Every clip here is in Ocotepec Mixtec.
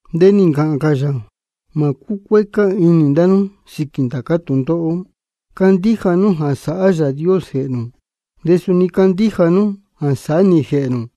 De nī ncāhān cā yā: Mā cúcuécá inī ndá nú sīquī ndācá tūndóhó. Candíja nú jā sáhá Yāā Dios jēhē nū, de suni candíja nú jā sáhá nī jēhē nū.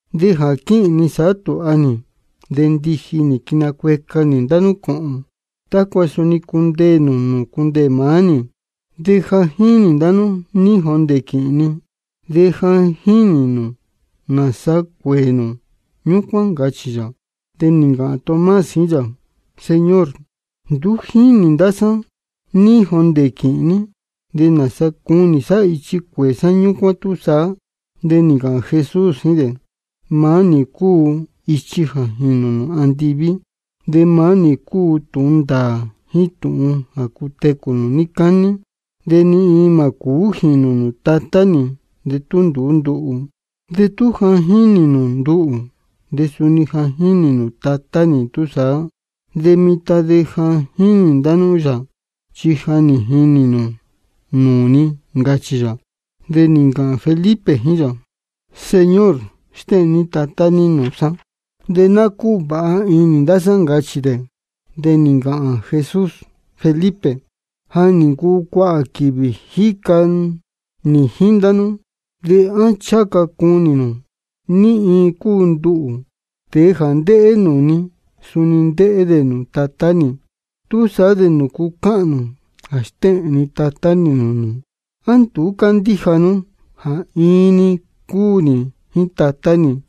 De jā quíhīn ni sāhá tūha nī, de ndiji nī quinacueca nī ndá nú cōhōn, tácua suni cundeē nū nūū cundeē maá nī. De ja jínī ndá nú ní jondē quīhīn ni, de ja jínī nū nāsa cuēē nū ñúcuán, ncachī yā. De nī ncāhān Tomás jíín yā: Señor, nduú jínī ndá sá ní jondē quīhīn ní, ¿de nāsa cunī sá ichi cuēē sá ñúcuán túsaá? De nī ncāhān Jesús jíín dē: Maá nī cúu ichi jā jīnū nū andiví, de maá nī cúu tūhun ndāā jíín tūhun jā cutecū nū níí cání. De ni iin mā cūú jīnū nūū Tatá nī de tú nduú nduhū. De tú ja nī jinī nū nduhū, de suni ja nī jinī nū Tatá nī túsaá. De mitan de ja jínī ndá nú yā, chi ja nī jinī nū nūū ni, ncachī yā. De nī ncāhān Felipe jíín yā: Señor, stéhēn ní Tatá ní nūū sá, de ná cúvāha inī ndá sá, ncachī dē. De nī ncāhān Jesús: Felipe, ja nī ncuu cuāhā quīvī jíca nī jíín ndá nú, ¿de á ncháha ca cunī nū ní iin cúu nduhū? Tēe jā ndéhé nūū ni, suni ndéhé dē nūū Tatá nī. ¿Túsaá de nūcu cáhān nū jā stéhēn ni Tatá nī nūū nū? ¿A nduú cándíja nú jā iin-ni cúu nī jíín Tatá nī,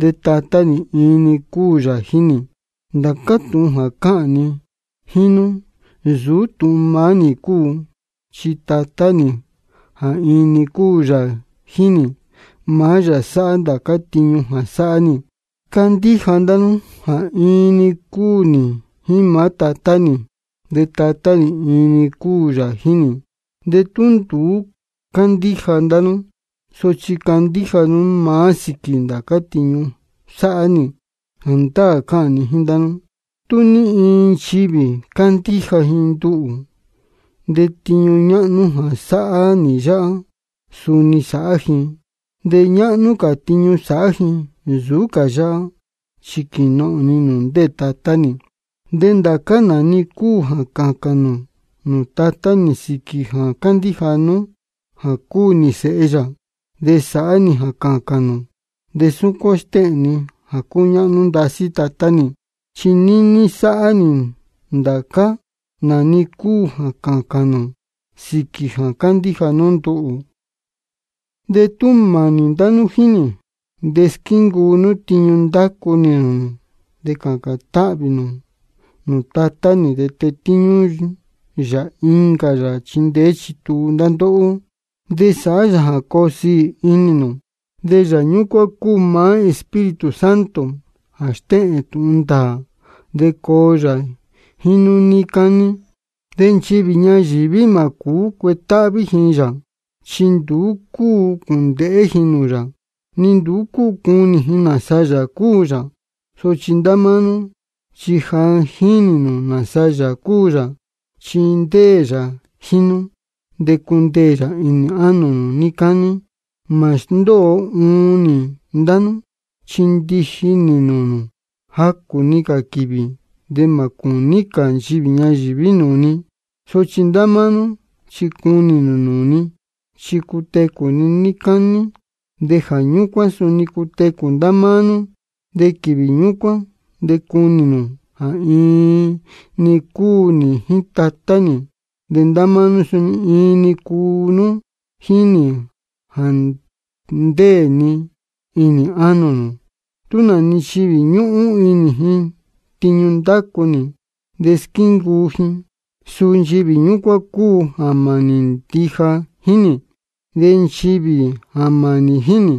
de Tatá nī iin-ni cúu yā jíín nī? Ndācá tūhun jā cáhān ni jíín nú, nsūú tūhun maá nī cúu. Chi Tatá nī jā iin-ni cúu yā jíín nī, maá yā sáhá ndācá tiñu jā sáhá nī. Candíja ndá nú jā iin-ni cúu nī jíín maá Tatá nī, de Tatá nī iin-ni cúu yā jíín nī. De tú nduú cúu candíja ndá nú, sochi candíja nú maá sīquī ndācá tiñu sáhá nī. Jāndáā cáhān ni jíín ndá nú, tú ní iin nchivī candíja ji nduhū, de tiñu ñáhnú jā sáhá nī yáhá, suni sāhá ji. De ñáhnú cā tiñu sāhá ji nsūú cā yáhá, chi quīnohōn ni nūū ndéē Tatá nī. De ndācá nā-ni cúu jā cācān nū nūū Tatá nī sīquī jā cándíja nú jā cúu nī Sēhe yā, de sāhá nī jā cācān nū, de súcuán stéhēn ni jā cúñáhnú ndasí Tatá nī. Chi níní sāhá nī ndācá nā-ni cúu jā cācān nū sīquī jā cándíja nú nduhū. De tú mānī ndá nú jíín nī, de squíncuu nú tiñu ndácu nī nūū nū. De cācān táhvī ni nūū Tatá nī, de tetíñú yā incā Yāā jā chindeé chituu ndá ndóhó, de sāhá yā jā coo siī inī nū. De Yāā ñúcuán cúu maá Espíritu Santo jā stéhēn tūhun ndāā, de coo yā jíín nú níí cání. De nchivī ñayīví mā cūú cuetáhví ji yā, chi nduú cúu cūndēhé ji nūū yā, ni nduú cúu cunī ji nāsa Yāā cúu yā. Sochi ndá máá nú chi ja jínī nū nāsa Yāā cúu yā, chi ndéē yā jíín nú, de cundeē yā inī ánō nū níí cání. Mā sndóo uun nī ndá nú, chi ndiji nī nūū nū. Jacū-ni cā quīvī de mā cūní cā nchivī ñayīví nūū ni. Sochi ndá máá nú chi cunī nū nūū ni, chi cutecū ni níí cání, de jā ñúcuán suni cutecū ndá máá nú. De quīvī ñúcuán de cunī nū jā iin-ni cúu nī jíín Tatá nī, de ndá máá nú suni iin-ni cúu nú jíín nī jā ndéē ni inī ánō nū. Tú nā-ni nchivī ñúhún inī ji tiñu ndácu nī, de squíncuu ji, suu nchivī ñúcuán cúu jā mānī ndija jíín nī. De nchivī jā mānī jíín nī,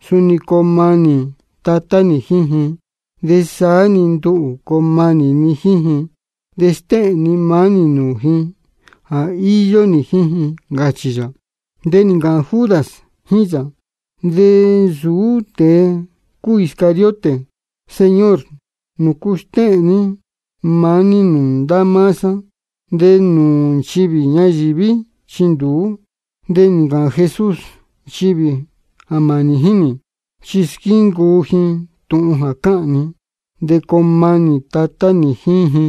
suni coo manī Tatá nī jíín ji. De saá-ni nduhū coo manī ni jíín ji, de stéhēn ni maá nī nūū ji jā íyó nī jíín ji, ncachī yā. De nī ncāhān Judas jíín yā (de nsūú tēe cúu Iscariote): Señor, ¿nūcu stéhēn ní maá ní nūū ndá máá sá, de nūū nchivī ñayīví chi nduú? De nī ncāhān Jesús: Nchivī jā mānī jíín nī, chi squíncuu ji tūhun jā cáhān ni. De coo manī Tatá nī jíín ji.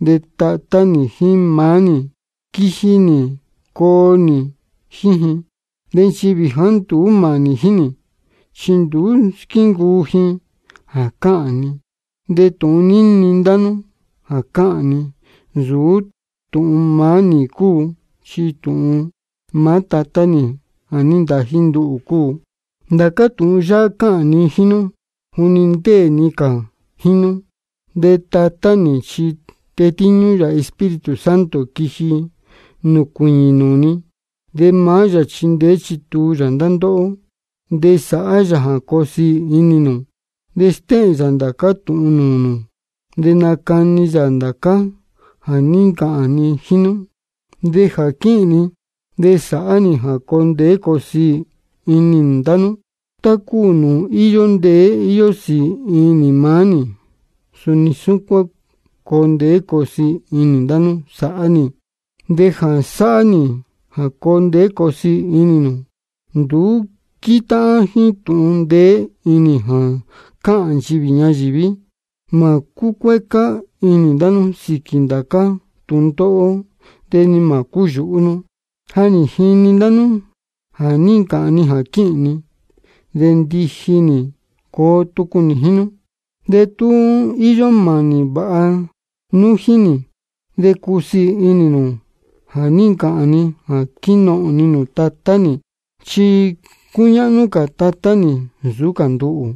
De Tatá nī jíín maá nī quiji nī coo nī jíín ji. De nchivī jāá nduú mānī jíín nī, chi nduú squíncuu ji jā cáhān ni. De tūhun níni ndá nú jā cáhān ni, nsūú tūhun maá nī cúu, chi tūhun maá Tatá nī jā ní ntají nduhū cúu. Ndācá tūhun yáhá cáhān ni jíín nú juni ndéē ni cā jíín nú. De Tatá nī chi tetíñú yā Espíritu Santo, quiji nūcuīñī nūū ni. De maá yā chindeé chituu yā ndá ndóhó, de sāhá yā jā coo siī inī nū. De stéhēn yā ndācá tūhun nūū nū, de nacachī yā ndācá jā ní ncāhān ni jíín nú. De jā quíhīn ni, de sāhá nī jā coo ndeé coo siī inī ndá nú. Tá cúu nūū íyó ndeé íyó sīī inī maá nī, suni súcuán coo ndeé coo siī inī ndá nú sāhá nī. De jā sāhá nī jā coo ndeé coo siī inī nū, nduú quítáhán jíín tūhun ndeé inī jā cáhān nchivī ñayīví. Mā cúcuécá inī ndá nú sīquī ndācá tūndóhó, de ni mā cúyūhú nú. Ja nī jini ndá nú jā ní ncāhān ni jā quíhīn ni, de ndiji nī coo tucu nī jíín nú. De tú íyó mānī vāha nú jíín nī, de cusiī inī nū jā ní ncāhān ni jā quínohōn ni nūū Tatá nī. Chi cúñáhnú cā Tatá nī nsūú cā nduhū.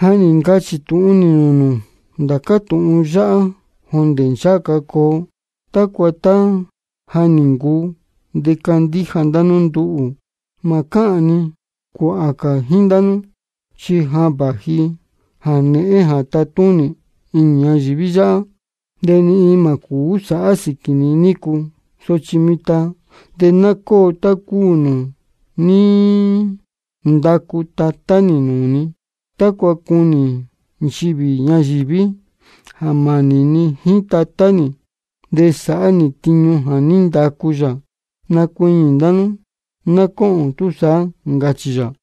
Ja nī ncachī tūhun nī nūū nū ndācá tūhun yáhá jondē ncháha ca coo, tácua tá ja nī ncuu, de candíja ndá nú nduhū. Mā cáhān ni cuāhā cā jíín ndá nú, chi ja vāji jānēhén jā tátúnī inī ñayīví yáhá. De ni iin mā cūú sāhá sīquī ni nícu. Sochi mitan de ná cóo tá cúu nūū ní ndacu Tatá nī nūū ni, tácua cunī nchivī ñayīví jā mānī ni jíín Tatá nī, de sáhá nī tiñu jā ní ndacu yā. Nacuiñī ndá nú ná cóhōn túsaá, ncachī yā.